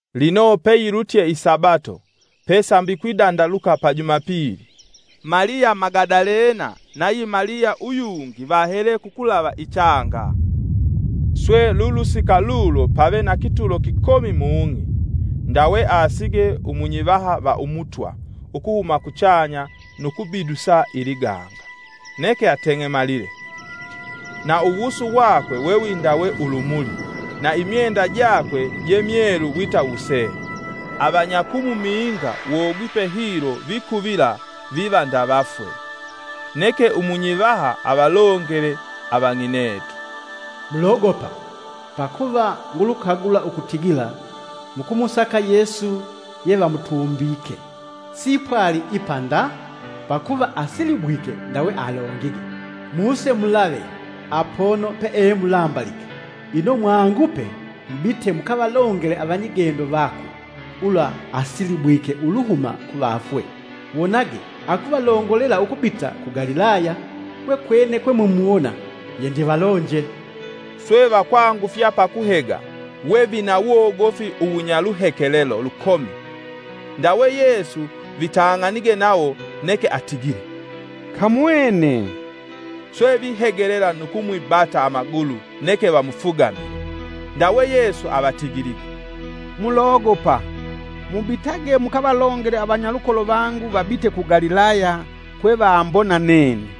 Lino peyilutye isabato, pe sambi kwidandaluka pa Jumapili, Maliya Magadalena nayi Maliya uyungi vahele kukulava ichanga. Swe lulusika lulo pave na kitulo kikomi mung'i; ndawe aasige umunyivaha va Umutwa ukuhuma kuchanya nu kubidusa iliganga, neke ateng'emalile. Na uwusu wakwe wewindawe ulumuli na imyenda jakwe je myelu wita wusee. Avanya kumuminga wogwipe hilo vikuvila viva nda vafwe. Neke umunyivaha avalongele avang'inetu, “Mulogopa! pakuva ngulukagula ukutigila mukumusaka Yesu yevamutumbike. Siipwali ipa nda, pakuva asilibwike ndawe alongige. Muse mulave apono peemulambalike. Ino mwangupe mubite mukavalongele avanyigendo vakwe ulwa asilibwike uluhuma kuvafwe wonage akuvalongolela ukubita ku Galilaya; kwekwene kwemumuwona. Yendivalonje.” Swe vakwangufya pakuhega wevinawogofi uwunyaluhekelelo lukomi. Ndawe Yesu vitang'anige nawo neke atigile, “Kamwene.” Swe vihegelela nu kumwibata amagulu neke vamufugamile. Ndawe Yesu avatigilige, “Mulogopa! Mubitage mukavalongele avanyalukolo vangu vabite ku Galilaya kwevambona nene.”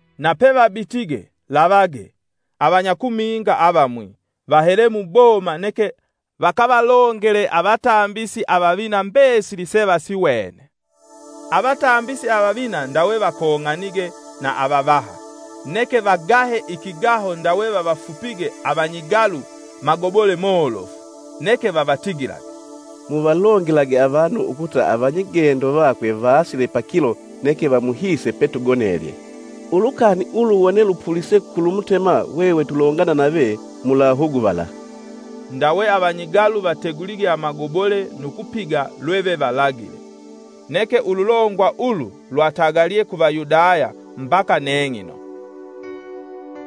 Na pevabitige, lavage, avanyakuminga avamwi vahele muboma neke vakavalongele avatambisi avavina mbesili sevasiwene. Avatambisi avavina ndawe vakong'anige na avavaha, neke vagahe ikigaho ndawe vavafupige avanyigalu magobole molofu. Neke vavatigilage, “Muvalongelage avanu ukuta avanyigendo vakwe vaasile pakilo neke vamuhiise petugonelye. Ulukani ulu wone lupulise kulumutema hwehwe tulongana nave mulahuguvala.” Ndawe avanyigalu vategulige amagobole nu kupiga lwevevalagile. Neke ululongwa ulu lwatagalye ku Vayudaya mbaka neng'ino.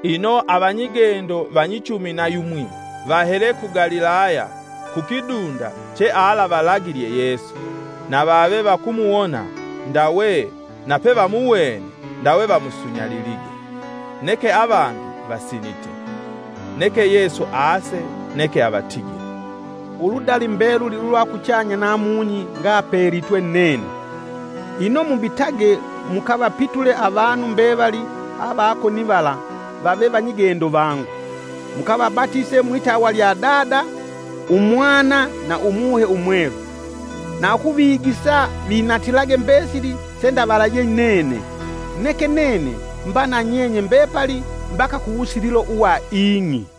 Ino avanyigendo vanyichumi na yumwi vahele ku Galilaya, kukidunda chealavalagilye Yesu. Na vave vakumuwona ndawe napevamuwene ndawe vamusunyalilige, neke avangi vasinite. Neke Yesu aase neke avatigile, “Uludali mbeluli ulwa kuchanya na mung'i ngapelitwe nene. Ino mubitage mukavapitule avanu mbevali ava konivala vave vanyigendo vangu, mukavabatise mwitawa lya Dada, Umwana na Umuhe umwelu. Na ukuvigisa vinatilage mbesili sendavalaje nene. Neke nene mba na nyenye mbepali mbaka kuwusililo uwa ing'i.”